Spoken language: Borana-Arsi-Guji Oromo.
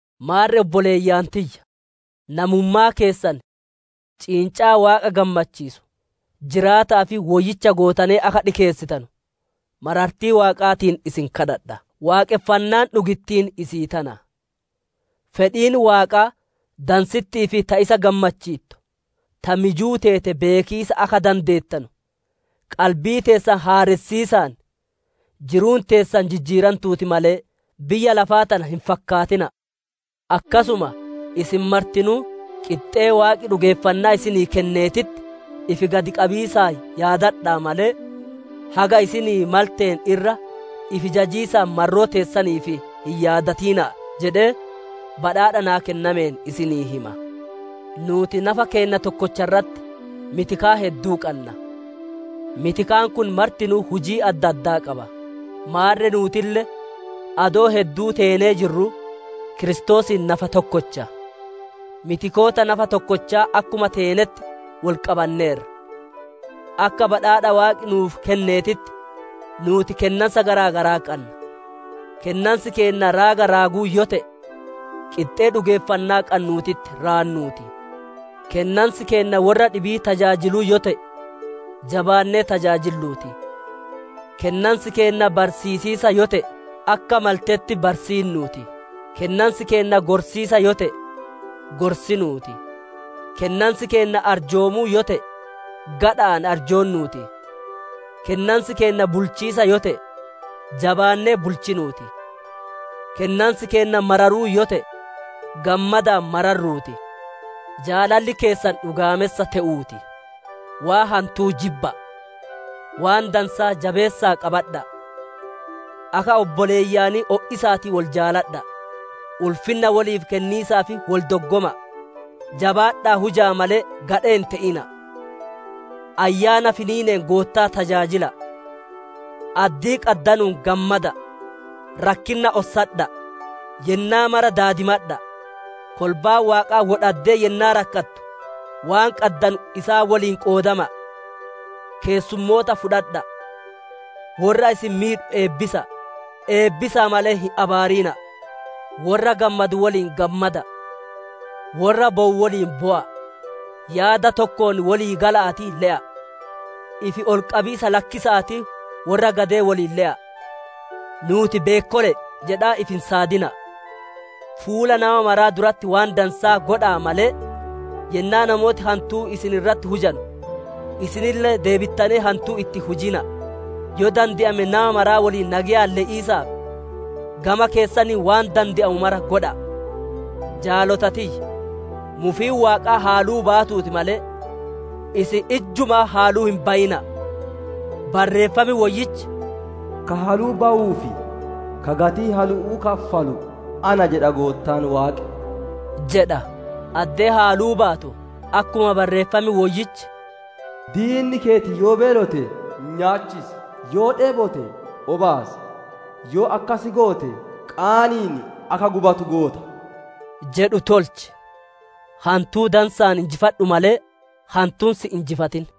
Maarre obboleeyyan tiyya! Namummaa keessan, ciincaa Waaqa gammachiisu, jiraata'aa fi woyyicha gootanee akka dhikeessitanu, marartii Waaqaatiin isin kadhadha; waaqonfannaan dhugittiin isii tana. Fedhiin Waaqaa dansitti'ii fi ta isa gammachiittu, ta mijuu teete beekiisa akka dandeettanu, qalbii teessan haaressiisaan jiruun teessan jijjiirantuuti malee, biyya lafaa tana hin fakkaatina'a. Akkasuma isin martinuu qixxee Waaqi dhugeeffannaa isinii kenneetitti ifi gad qabiisaan yaadadha'a malee, haga isinii malteen irra ifi jajiisaan marroo teessaniif hin yaadatina'a jedhee, badhaadha naa kennameen isinii hima. Nuuti nafa keenna tokkocha irratti mitikaa hedduu qanna; mitikaan kun martinuu hujii adda addaa qaba. Maarre nuutille, adoo hedduu teenee jirruu, Kiristoosiin nafa tokkocha; mitikoota nafa tokkochaa akkuma teenetti wol qabanneerra. Akka Badhaadha Waaqi nuuf kenneetitti nuuti kennansa gara garaa qanna. Kennansi keenna raaga raaguu yoo te'e, qixxee dhugeeffannaa qannuutitti raannuu ti; kennansi keenna worra dhibii tajaajiluu yoo te'e, jabaannee tajaajilluu ti; kennansi keenna barsiisiisa yoo te'e, akka maltetti barsiinnuu ti; kennansi keenna gorsiisa yoo te'e, gorsinuu ti; kennansi keenna arjoomuu yoo te'e, gadha'aan arjoonnuu ti; kennansi keenna bulchiisa yoo te'e, jabaannee bulchinuu ti; kennansi keenna mararuu yoo te'e, gammadaan mararruu ti; Jaalalli keessan dhugaamessa te'uu ti. Waan hantuu jibba'a; waan dansaa jabeessa'aa qabadha'a; Akka obboleeyyanii o'isa'aatii wol jaaladha'a; ulfinna woliif kenniisaaf wol doggoma'a. Jabaadha'aa huja'a malee, gadhee hin te'ina'a. Ayyaana finiineen Goottaa tajaajila'a. Addii qaddanuun gammada'a; rakkinna ossadha'a; yennaa mara daadimadha'a. Kolbaan Waaqaa wo dhaddee yennaa rakkatu waan qaddanu isaan woliin qoodama'a; keessummoota fudhadha'a. Worra isin miidhu eebbisa'a; eebbisa'a malee hin abaarina'a. Worra gammadu woliin gammada'a; worra bowu woliin bowa'a. Yaada tokkoon wolii gala'aatii le'a; ifi ol qabiisa lakkisa'aatii worra gadee woliin le'a; nuuti beekkole'e jedhaa ifi hin saadina'a. Fuula nama maraa duratti waan dansaa godha'a malee, yennaa namooti hantuu isin irratti hujanu, isinille deebittanee hantuu itti hin hujina'a. Yoo dande'ame nama maraa woliin nageyaan le'iisaaf, gama keessaniin waan dande'amu mara godha'a. Jaalota tiyya! Mufiin Waaqaa haluu baatuutii malee, isin ijjumaa haluu hin bayina'a. Barreeffam Woyyichi, «Ka haluu bawuu fi ka gatii halu'uu kaffalu ana jedha Goottaan Waaqi» jedha. Addee haluu baatu, akkuma Barreeffam Woyyichi, «Diinni keeti yoo beelote, nyaachis, yoo dheebote obaas; Yoo akkas goote qaani'iin akka gubatu goota» jedhu tolchi. Hantuu dansa'aan injifadhu malee, hantuun si hin injifatin.